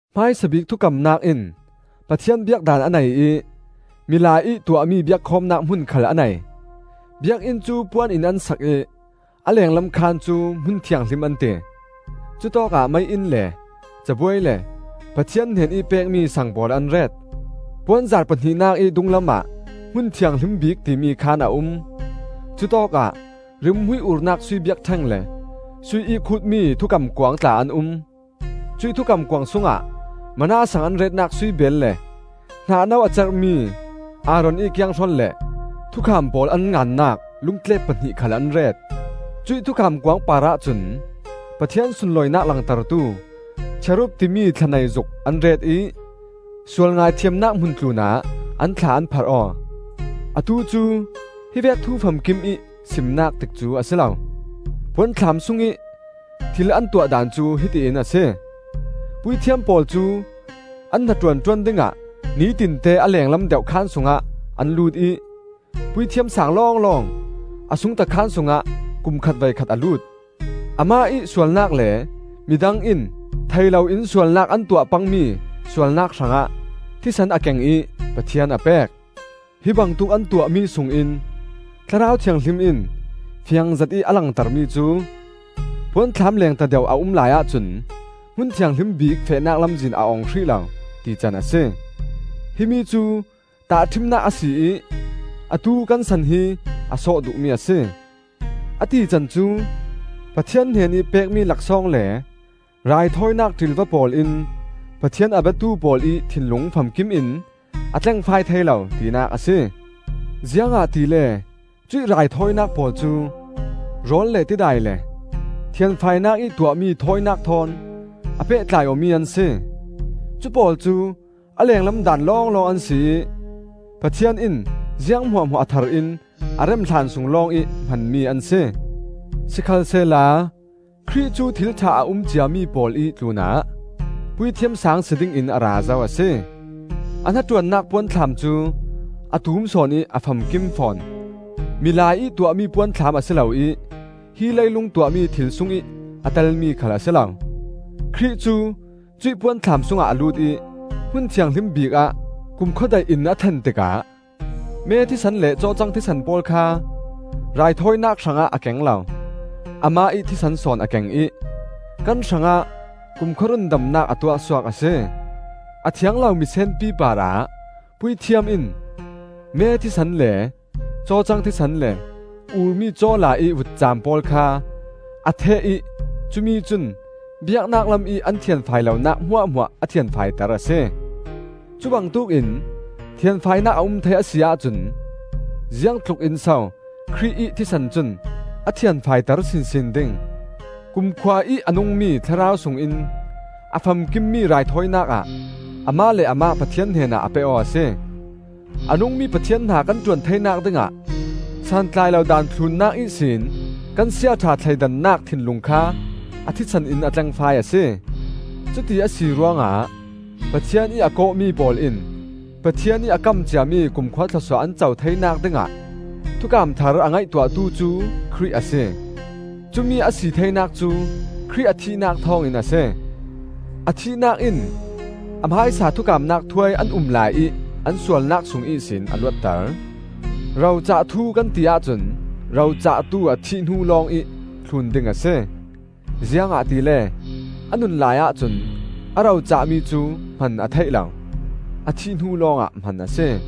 Hmaisa bik Thukamnak in Pathian biak daan a nei ih milai ih tuahmi biakkhawmnak hmun khal a nei. Biakinn cu puan in an sak ih a lenglam khaan cu Hmun Thianghlim an ti. Cutawkah mei-inn le cabuai le Pathian hnenih pekmi saang pawl an ret. Puanzar pahnihnak ih dunglamah Hmun Thianghlim Bik timi khaan a um. Cutawkah rimhmui urnak sui biakṭheng le sui ih khutmi Thukam Kuang tla an um. Cuih Thukam Kuang sungah manna saang an retnak sui beel le hnah-no a cerhmi Aaron ih kianghrol le thukham pawl an ngannak lungtlep pahnih khal an ret. Cuih Thukam Kuang parah cun Pathian sunlawinak langtertu Cherub timi thlanei zuk an ret ih sual ngaithiamnak hmun tlunah an thla an pharh aw. Atu cu hi vek thu famkimih simnak tikcu a si lo. Puanthlam sungih thil an tuah daan cu hiti in a si. Puithiam pawl cu an hnaṭuan ṭuan dingah nitinte a lenglam deuh khaan sungah an lut ih, Puithiam Saang lawnglawng a sungta khaan sungah kum khat voikhat a lut. Amah ih sualnak le mi dang in thei loin sualnak an tuah pangmi sualnak hrangah thisen a keng ih Pathian a pek. Hi bangtuk an tuahmi sungin Thlarau Thianghlim in fiang zetih a langter mi cu: puanthlam lengta deuh a um lai ahcun Hmun Thianghlim Bik fehnak lamzin a ong hrih lo, tican a si. Himi cu tahṭhimnak a si ih atu kan san hi a sawh duhmi a si. A tican cu, Pathian hnenih pekmi laksawng le raithawinak ṭilva pawl in Pathian a biatu pawl ih thinlung famkim in a tlengfai thei lo, tinak a si. Ziangahtile cuih raithawinak pawl cu rawl le tidai le thianfainak ih tuahmi thawinak thawn a pehtlai awmi an si. Cu pawl cu a lenglam daan lawnglawng an si ih Pathian in ziang hmuahhmuah a thar in a rem hlan sung lawngih hmanmi an si. Sikhalsehla Khrih cu thil ṭha a um ciami pawl ih tlunah Puithiam Saang si dingin a ra zo a si. A hnaṭuannak puanthlam cu a tum sawn ih a famkim fawn. Milai ih tuahmi puanthlam a si lo ih hi leilung tuahmi thil sungih a telmi khal a si lo. Khrih cu cuih puanthlam sungah a lut ih Hmun Thianghlim Bik ah kumkhua daihin a thlen tikah me thisen le cawcang thisen pawl kha raithawinak hrangah a keng lo; amah ih thisen sawn a keng ih kan hrangah kumkhua rundamnak a tuahsuak a si. A thiang lo misenpi parah puithiam in me thisen le cawcang thisen le urmi cawla ih vutcam pawl kha a theh ih cumi cun biaknak lamih an thianfai lonak hmuahhmuah a thianfaiter a si. Cubangtuk in thianfainak a um thei a si ahcun ziang tlukin so Khrih ih thisen cun a thianfaiter sinsin ding! Kumkhua ih a nungmi Thlarau sungin a famkimmi raithawinak ah amah le amah Pathian hnenah a pe aw a si. A nungmi Pathian hna kan ṭuan theinak dingah, santlai lo daan thlunnak ihsin kan siaṭha thleidannak thinlung kha a thisen in a tlengfai a si. Cuti a si ruangah Pathian ih a kawhmi pawl in Pathian ih a kam ciami kumkhua thlawsuah an co theinak dingah thukam thar a ngaihtuahtu cu Khrih a si. Cumi a si theinak cu Khrih a thihnak thawngin a si. A thihnak in a hmaisa thukamnak thuai an um laiih an sualnak sung ihsin a luatter. Ro cah thu kan ti ahcun ro cahtu a thih hnu lawngih thlun ding a si; ziangahtile a nun lai ahcun a ro cahmi cu hman a theih lo; a thih hnu lawngah hman a si.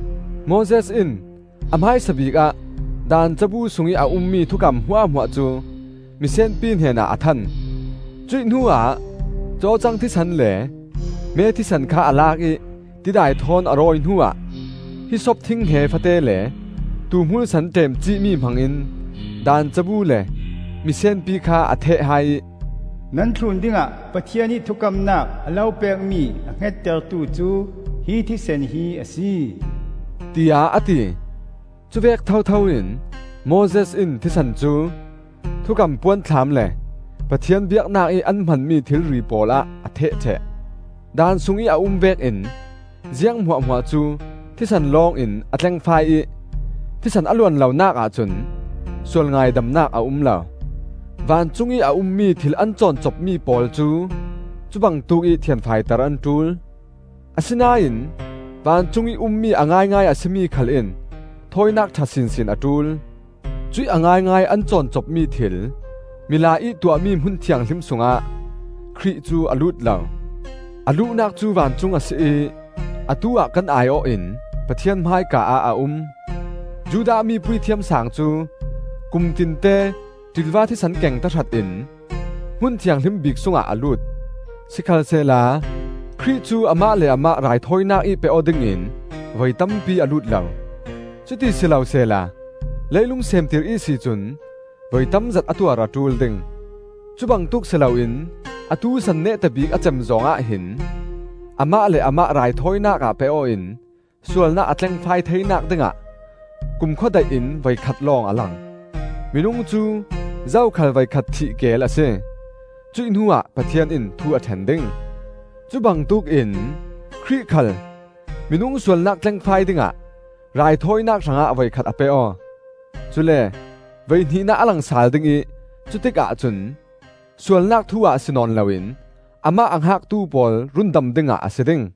Moses in a hmaisabik ah Daan cabu sungih a ummi thukam hmuahhmuah cu misenpi hnenah a than. Cuih hnuah cawcang thisen le me thisen kha a lak ih tidai thawn a rawi hnuah, hissop thinghnge fate le tuuhmul sen ṭemcihmi hmangin, Daan cabu le misenpi kha a theh hai ih, “Nan thlun dingah Pathian ih thukamnak a lo pekmi a hngettertu cu hi thisen hi a si,” tiah a ti. Cuvek thotho in Moses in thisen cu Thukam Puanthlam le Pathian biaknak ih an hmanmi thilri pawlah a theh ṭheh. Daan sungih a um vekin ziang hmuahhmuah cu thisen lawngin a tlengfai ih thisen a luan lonak ahcun sualngaidamnak a um lo. Vancung ih a ummi thil an cawncopmi pawl cu cubangtuk ih thianfaiter an ṭul. Asinain vancungih ummi a ngaingai a si mi khal in thawinak ṭha sinsin a ṭul. Cuih a ngaingai an cawncopmi thil, milai ih tuahmi Hmun Thianghlim sungah Khrih cu a lut lo. A luhnak cu vancung a si ih atu-ah kan ai-awh in Pathian hmaika ah a um. Judah mi Puithiam Saang cu kumtinte ṭilva thisen keng tahratin Hmun Thianghlim Bik sungah a lut. Sikhalsehla Khrih cu amah le amah raithawinak ih pe-aw dingin voi tampi a lut lo; cuti si lo sehla leilung seemtir ihsi cun voi tamzet a tuar a ṭul ding. Cubangtuk si loin atu san neta bik a cem zawng ah hin, amah le amah raithawinak ah pe-aw in sualnak a tlengfai theinak dingah kumkhua daih in voikhat lawng a lang. Minung cu zokhal voikhat thih keel a si; cuih hnuah Pathian in thu a ṭhen ding. Cubangtuk in Khrih khal minung sualnak tlengfai dingah raithawinak hrangah voikhat a pe-aw. Cule voihnihnak a lang sal dingih cutik ahcun sualnak thu-ah si nawn loin amah a hngaktu pawl rundam dingah a si ding.